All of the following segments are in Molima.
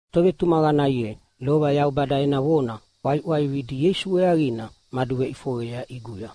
Tovetumaqana ye, lova Yaubada ena vona ʼwaiʼwaivina Ieisu weaqina maduveʼifoqeyea ʼiguya,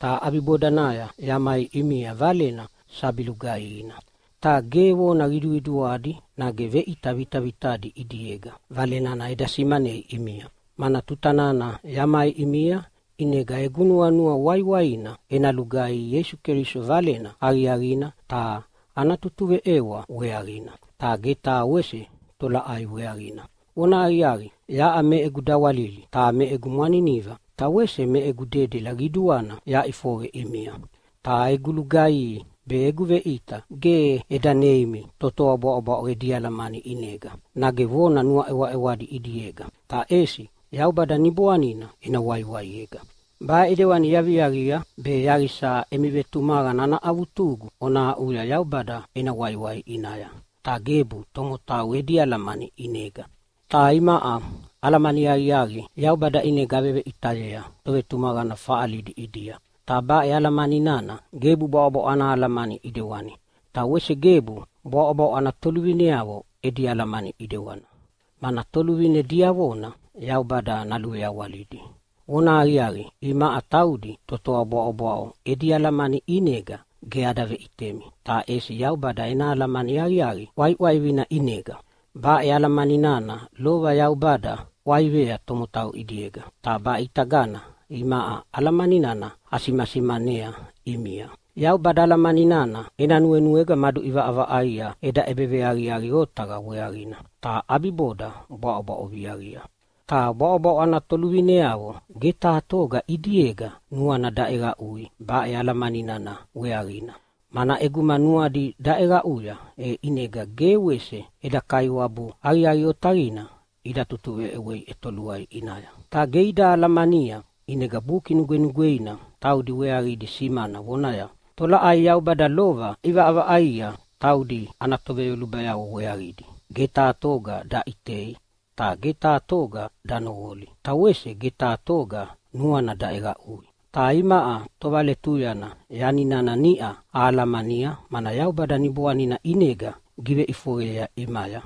ta ʼabibodanaya yamai ʼimia Valena sabi lugaihina. Ta ge vona qiduqiduadi nage veʼita vitavitadi ʼidiega Vale nana eda simanei ʼimia. Mana tuta nana yamai ʼimia ʼinega egu nuanua waiwaina ena lugaihi Ieisu Keliso Valena Aqiaqina ta ana tutuveʼewa weaqina, ta ge taha wese tolaʼai weaqina. Vonahaqiaqi, yaʼa me egu dawalili ta me egu mwaniniva ta wese me egu dedela qiduana yaʼifoqe ʼimia. Ta egu lugaihi be egu veʼita ge eda neimi totoa bwaʼobwaʼo edi alamani ʼinega nage vona nuaʼewaʼewadi ʼidiega, ta ʼesi Yaubada Niboanina ena waiwaiega. Baʼe ʼidewani yaviaqia, be yaqisa emi vetumaqana ana avutugu ona aʼuya Yaubada ena waiwai ʼinaya, ta gebu tomotau edi alamani ʼinega. Ta imaʼa alamani aqiaqi Yaubada ʼinega aveveʼitayea tovetumaqana faʼalidi ʼidia. Ta baʼe alamani nana gebu bwaʼobwaʼo ana alamani ʼidewani, ta wese gebu bwaʼobwaʼo ana toluvineavo edi alamani ʼidewana, mana toluvine diavona Yaubada naluveawalidi. Vonahaqiaqi, imaʼa taudi totoa bwaʼobwaʼo edi alamani ʼinega ge ada veʼitemi, ta ʼesi Yaubada ena alamani aqiaqi ʼwaiʼwaivina ʼinega. Baʼe alamani nana lova Yaubada ʼwaivea tomotau ʼidiega, ta baʼe ʼitagana imaʼa alamani nana asimasimanea ʼimia. Yaubada alamani nana ena nuenuega maduʼivaʼavaʼaia eda ʼebeveaqiaqi otaqa weaqina, ta ʼabiboda bwaʼobwaʼo viaqia. Ta bwaʼobwaʼo ana toluvineavo ge taha toga ʼidiega nuana daʼeqaʼui baʼe alamani nana weaqina, mana ʼeguma nuadi daʼeqaʼuya, e ʼinega ge wese eda Kaiwabu aqiaqi otaqina ida tutuveʼewei ʼetoluai ʼinaya. Ta ge ida alamania. ʼInega Buki Nugwenugweina taudi weaqidi simana vonaya, “Tolaʼai Yaubada lova ʼivaʼavaʼaia taudi ana toveyolubayavo weaqidi ge taha toga daʼitei, ta ge taha toga danoqoli ta wese ge taha toga nuana daʼeqaʼui.” Ta imaʼa tovaletuyana yani nana niʼa ahalamania, mana Yaubada Niboanina ʼinega giveʼifoqeyea ʼimaya.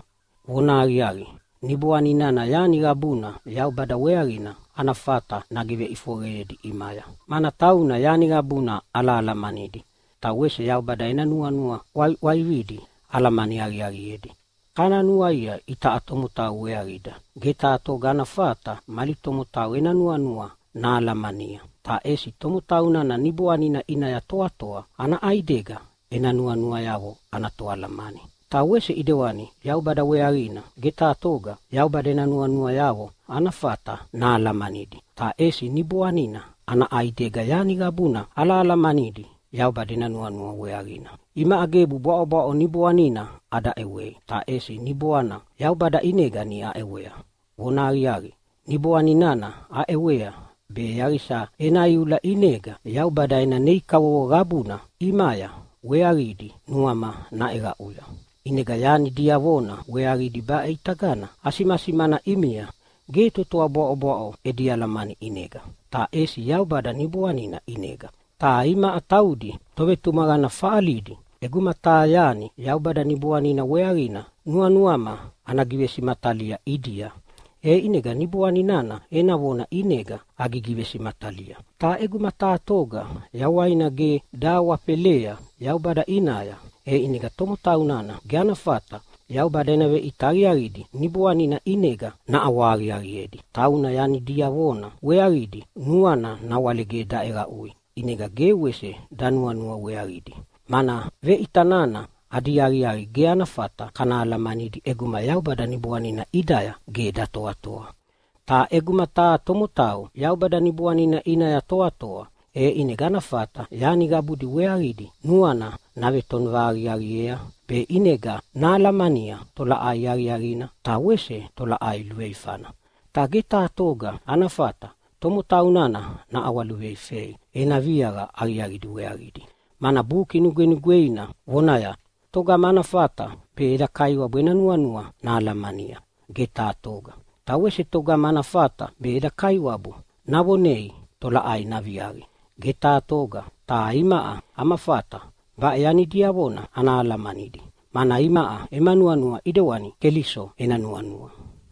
Vonahaqiaqi, Niboani nana yani qabuna Yaubada weaqina ana fata nagiveʼifoqeyedi ʼimaya, mana tauna yani qabuna alahalamanidi, ta wese Yaubada ena nuanua ʼwaiʼwaividi alamani aqiaqiedi. Kana nuaia itaʼa tomotau weaqida. Ge taha toga ana fata mali tomotau ena nuanua nahalamania, ta ʼesi tomotau nana niboanina ʼinaya toatoa ana ʼaidega ena nuanuayavo ana toalamani. Ta wese ʼidewani Yaubada weaqina. Ge taha toga Yaubada ena nuanuayavo ana fata nahalamanidi, ta ʼesi Niboanina ana ʼaidega yani qabuna alahalamanidi Yaubada ena nuanua weaqina. Imaʼa gebu bwaʼobwaʼo niboanina ada ʼewei, ta ʼesi Niboana Yaubada ʼinega niʼa aʼewea. Vonahaqiaqi, Niboani nana aʼewea be yaqisa ena iula ʼinega Yaubada ena nei kavovo qabudi ʼimaya weaqidi nuama naʼeqaʼuya. ʼInega yani diavona weaqidi baʼe ʼitagana asimasimana ʼimia ge totoa bwaʼobwaʼo edi alamani ʼinega, ta ʼesi Yaubada Niboanina ʼinega. Ta imaʼa taudi tovetumaqana faʼalidi ʼeguma taha yani Yaubada Niboanina weaqina nuanuama ana givesimatalia ʼidia, e ʼinega Niboana nana ena vona ʼinega agigivesimatalia. Ta ʼeguma taha toga yawaina ge dahawafelea Yaubada ʼinaya, e ʼinega tomotau nana ge ana fata Yaubada ena veʼita aqiaqidi Niboanina ʼinega naʼawahaqiaqiedi. Tauna yani diavona weaqidi nuana nawale ge daʼeqaʼui, ʼinega ge wese danuanua weaqidi, mana veʼita nana adi aqiaqi ge ada fata kana alamanidi ʼeguma Yaubada Niboanina ʼidaya ge datoatoa. Ta ʼeguma taha tomotau Yaubada Niboanina ʼinaya toatoa, e ʼinega ana fata yani qabudi weaqidi nuana navetonova aqiaqiea, be ʼinega nahalamania tolaʼai aqiaqina ta wese tolaʼai luveifana. Ta ge taha toga ana fata tomotau nana naʼawaluveifei ena viaqa aqiaqidi weaqidi. Mana Buki Nugwenugweina vonaya, “Togama ana fata be eda Kaiwabu ena nuanua nahalamania? Ge taha toga! Ta wese togama ana fata be eda Kaiwabu navonei tolaʼai naviaqi? Ge taha toga!” Ta imaʼa ama fata baʼe yani diavona ana alamanidi, mana imaʼa ema nuanua ʼidewani Keliso ena nuanua.